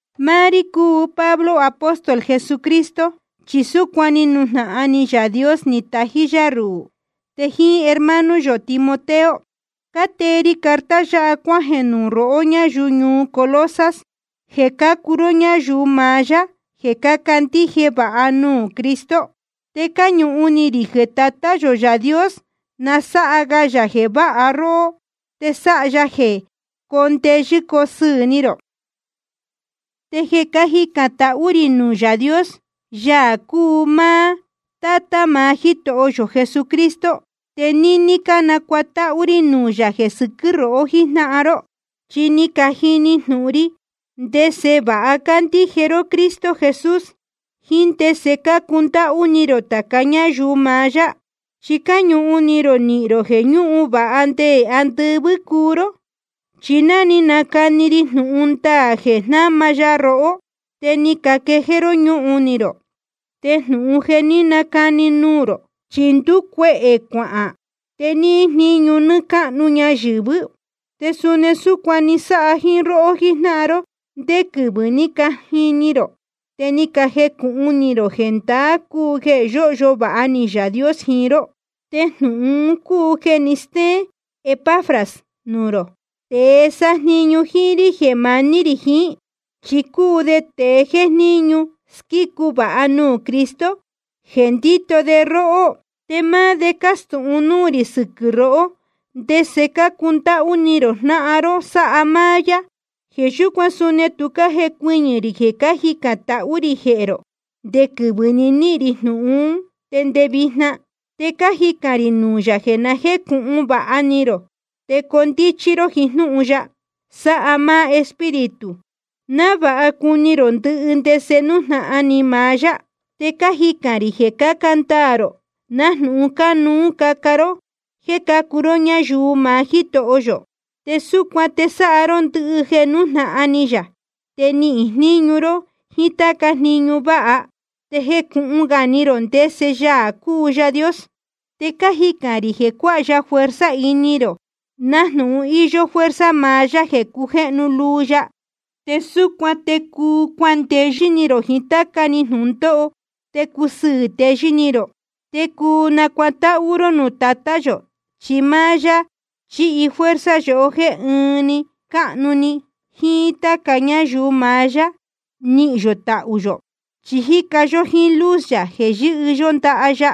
Máá rí cúu Pablo, apóstol Jesucristo, chi súcuan ni nujnahan ni Yaā Dios ni tají yá ruhū. Te jíín hermano yō Timoteo cátee ri carta yáha cuájeē nuū rohó ñáyuu ñuu Colosas, jeē cácuu ró ñáyuu maá yá jeē cácandíje vāha nuū Cristo. Te cáñuhun ni rī jeē Tatá yō Yaā Dios na sáha ga yā jeē váha róhó, te sáha ya jeē coo ndeyɨ́ coo sɨɨ̄ ni rō. Te jeē cájicān tahú rī nuū Yaā Dios, Yaā cúu Tátá maá Jítoho yō Jesucristo, te níní cánacuatáhú rí nuū yā jeē sɨquɨ́ rohó jíjnáhan ró. Chi ni cajini jnūhun ri ndese vāha cácandíje ró Cristo Jesús, jíín ndese cácundáhú ni rō tāca ñáyuu maá yá. Chi cáñuhun ni rō nihīn rō jeē ñúhun vāha nde andɨvɨ́ cuu ró. Chi ná ni cajini ró jnúhun ndaā jeē jnáma ya rohó, te ni caquejéé ró ñúhun ni rō. Te jnūhun un jéē ní canacani nuū rō, chi ndúcuehē cuahān te níhín jníñu nɨɨ́ cáhnu ñayɨ̄vɨ́. Te suni súcuan ni sáha jíín róhó jíjnáhan ró ndé quɨvɨ̄ ní cajini ró te ni cajecūhun ni rō jeē ndaá cúu jeē yóhyo vāha ni Yaā Dios jiín ró. Te jnūhun un cúu jeē ni stéén Epafras nuū rō, tēe sájniñu jíín rí jeē maní rī jiín. Chi cúu de tēe jéjníñu squícu vāha nuū Cristo jeē ndíto de róhó. Te máá de ni castūhun núū rī sɨquɨ̄ rohó, ndese cácundáhú ni rō jnáhan ró sáha máá yá. Jeē yúcuan suni tu cájecuɨñɨ̄ rī jeē cájicān tahú rī jehē rō, nde quɨvɨ̄ ni níhīn rī jnūhun ún te nde vijna. Te cájicān rī nuū yā jeē na jécūhun vāha ni rō te coo ndíchí ró jiín jnúhun ya, sáha máá Espíritu, návāha cuni rō ndɨhɨ ndese nújnahan ni maá yá. Te cájicān rī jeē caca ndaā rō nájnūhun cánuú caca ró jéē cácuu ró ñáyuu maá Jítoho yō. Te súcuan te sáha ró ndɨhɨ jeē nújnahan ni yā, te nihīn jníñu ró jiín táca jniñu váha, te jecūhun ga ni rō ndese Yaā cúu Yaā Dios. Te cájicān rī jeē cuáha ya fuerza ini rō, nájnūhun íyó fuerza maá yá jeē cujéhnu luu ya. Te súcuan te cuu cuandeyɨ́ ni rō jiín táca‑ni jnūndóho, te cusɨɨ̄ teyɨ́ ni rō. Te cuu nacuatáhú ró nuū Tatá yō, chi máá yá ni chihi fuerza yohó jéē ɨɨn cáhnu‑ni jíín táca ñáyuu maá yá nihīn yō tahū yō. Chi cájica yó jíín luz yā jeē yɨ́hɨ yó ndaha ya.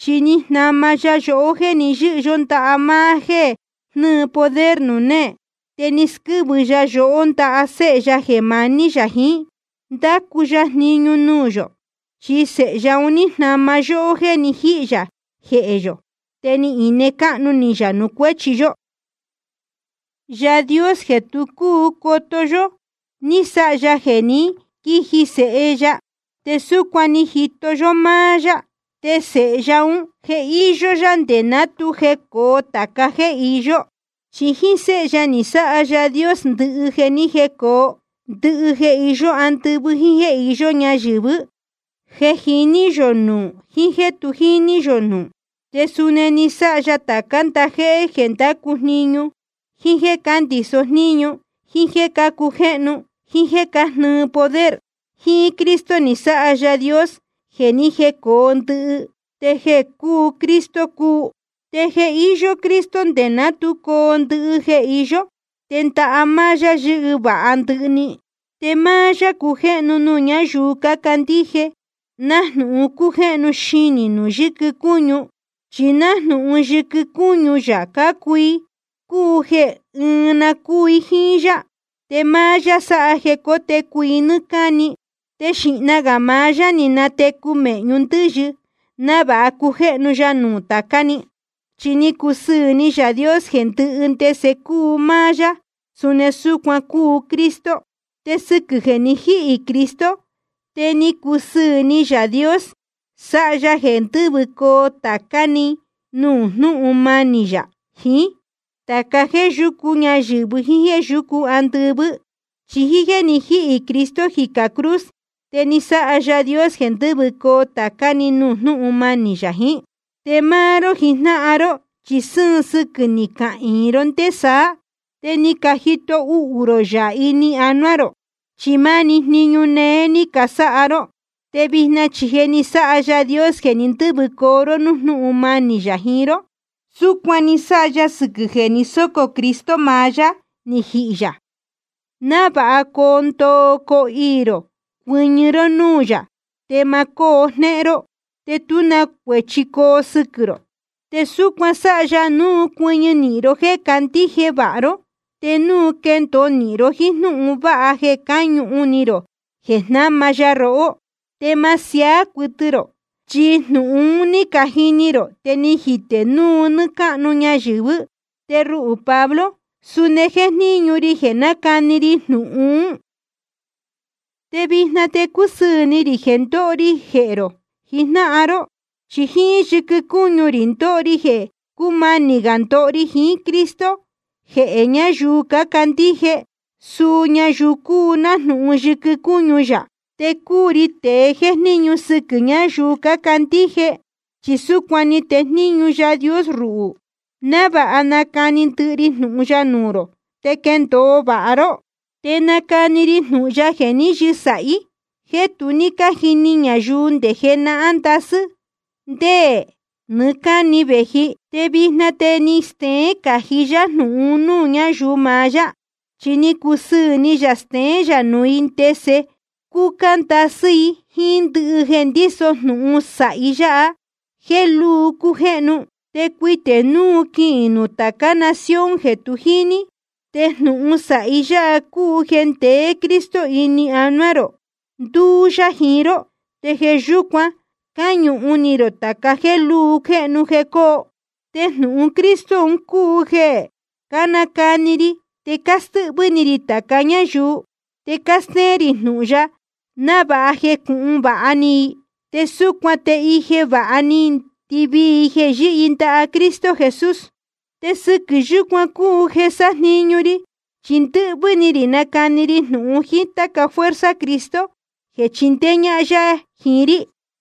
Chi ni jnama ya yohó jéē ni yɨ́hɨ yó ndaha máá jéē jnɨ́ɨ poder nuū néē, te ni squɨ́vɨ ya yohó ndaha Séhe ya jeē maní yā jiín, ndácu ya jniñu nuū yō. Chi Sēhe ya un ní jnama ya yohó jéē ni jíhī yā jehē yō, te ni ine cáhnu ni yā nuū cuéchi yó. Yaā Dios jeē tu cúu coto yó, ni sáha ya jeē ní quiji Sēhe ya, te súcuan ni jito yó máá yá. Te Sēhe ya ún, je íyó yá nde ná tu jecōo tāca jéē iyó. Chi jíín Séhe ya ni sáha Yaā Dios ndɨhɨ jeē ni jécōo, ndɨhɨ jeē iyó andɨvɨ́ jíín jéē iyó ñayɨ̄vɨ́, jeē jiní yō nuū jiín jéē tu jíní yō nuū. Te suni ni sáha ya tācá ndajéhé jeē cándacu jniñu, jíín jéē cándiso jníñu, jíín jéē cácujéhnu, jíín jéē cájnɨɨ poder. Jíín Cristo ni sáha Yaā Dios jeē ni jécōo ndɨhɨ, te jeē cúu Cristo cúu. Te je íyó Cristo nde ná tu coo ndɨhɨ jeē iyó. Te ndaha máá yá yɨ́hɨ vāha ndɨhɨ‑ni. Te máá yá cújéhnu nuū ñáyuu cácandíje, nájnūhun cújéhnu xinī nuū yɨquɨ cúñu, chi nájnūhun yɨquɨ cúñu yā cácuu i, cúu jeē ɨɨn na cúu i jíín yá. Te máá yá sáha jeē cotecu i nɨ́ɨ́ cáni, te xīhna gā maá yá ni natecu mēhñu ndɨ́yɨ, návāha cujéhnu ya nuū tācá‑ni. Chi ni cusɨɨ̄ ni Yaā Dios jeē ndɨhɨ ndese cúu máá yá, suni súcuan cúu Cristo. Te sɨquɨ̄ jeē ni jíhī Cristo, te ni cusɨɨ̄ ni Yaā Dios sáha ya jeē ndɨ́vɨcoo tācá‑ni nuū jnúhun manī yā jiín, tāca jéē yúcu ñayɨ̄vɨ jíín jéē yúcu andɨvɨ́. Chi jíín jéē ni jíhī Cristo jicā cruz, te ni sáha Yaā Dios jeē ndɨ́vɨcoo tācá‑ni nuū jnúhun manī yā jiín. Te máá ró jijnáhan ró, chi sɨ́ɨn sɨquɨ̄ ni cahīin ró ndé saá, te ni cajito uhū rō yā ini anuá rō, chi máni jniñu néé ní casáha ró. Te vijna chi je ni sáha Yaā Dios jeē ní ndɨ̄vɨcoo ró núū jnúhun manī yā jiín ró. Súcuan ni sáha ya sɨquɨ̄ jeē ni sócō Cristo maá yá ni jihī yā, návāha coo ndoo coo iī rō cuɨñɨ ró núū yā, te ma cóo jnéhén ró, te tú na cuēchi coo sɨquɨ̄ rō. Te súcuan sáha ya núu cuɨñɨ nīhin ró jéē candíje vāha ró, te núu quendōo nīhin ró jíín jnúhun vāha jeē cáñuhun ni rō jeē jnáma ya rohó, te ma siaá cuɨtɨ rō. Chi jnūhun un ní cajini ró, te ni jite núu nɨ́ɨ́ cáhnu ñayɨ̄vɨ́. Te ruhū Pablo suni jéjníñu ri jeē nácani ri jnūhun ún. Te vijna te cúsɨɨ̄ ni rī jeē ndóho ri jehē rō jijnáhan ró. Chi jíín yɨquɨ cúñu rī ndóho ri jeē cúmanī gā ndoho ri jiín Cristo jehē ñáyuu cácandíje, suu ñayuu cúu nájnūhun yɨquɨ cúñu yā. Te cúu ri tēe jéjníñu sɨquɨ̄ ñáyuu cácandíje, chi súcuan ni tejníñu Yaā Dios ruhū, návāha nacani ndɨhɨ ri jnūhun ya nuū rō te quendōo vāha ró. Te nácani ri jnūhun ya jeē ní yɨsāhí, jeē tu ní cájini ñayuu nde jenahán ndasɨ́ te nde nɨɨ́ cáni vēji. Te vijna te je ni steén cají yá jnūhun un núū ñáyuu maá yá. Chi ni cusɨɨ̄ ni yā jeē steén yā nuū i ndese cúcúcá ndasɨ́ i jíín ndɨhɨ jeē ndíso jnūhun sāhi yáha jéē lúu cújéhnu, te cuitē núu quihīn nuū tācá nación jeē tu jíní. Te jnūhun sāhi yáha cúu jeē ndeé Cristo ini anuá rō, ndúú yá jiín ró, te jeē yúcuan cáñuhun ni rō tāca jéē lúu jéhnu jeē coo. Te jnūhun Cristo un cúu jeē cánacani ri, te cástɨ́hvɨ́ ni rī tāca ñáyuu, te cástéén rī jnūhun ya návāha jecūhun vāha ni i. Te súcuan te ije vāha ni ndɨvii i jeē yɨ́hɨ i ndaha Cristo Jesús. Te sɨquɨ̄ yúcuan cúu jeē sájniñu ri, chi ndɨ́hvɨ́ ni rī nácani ri jnūhun jíín táca fuerza Cristo jeē chindéé ñájnáhan ya jiín rí.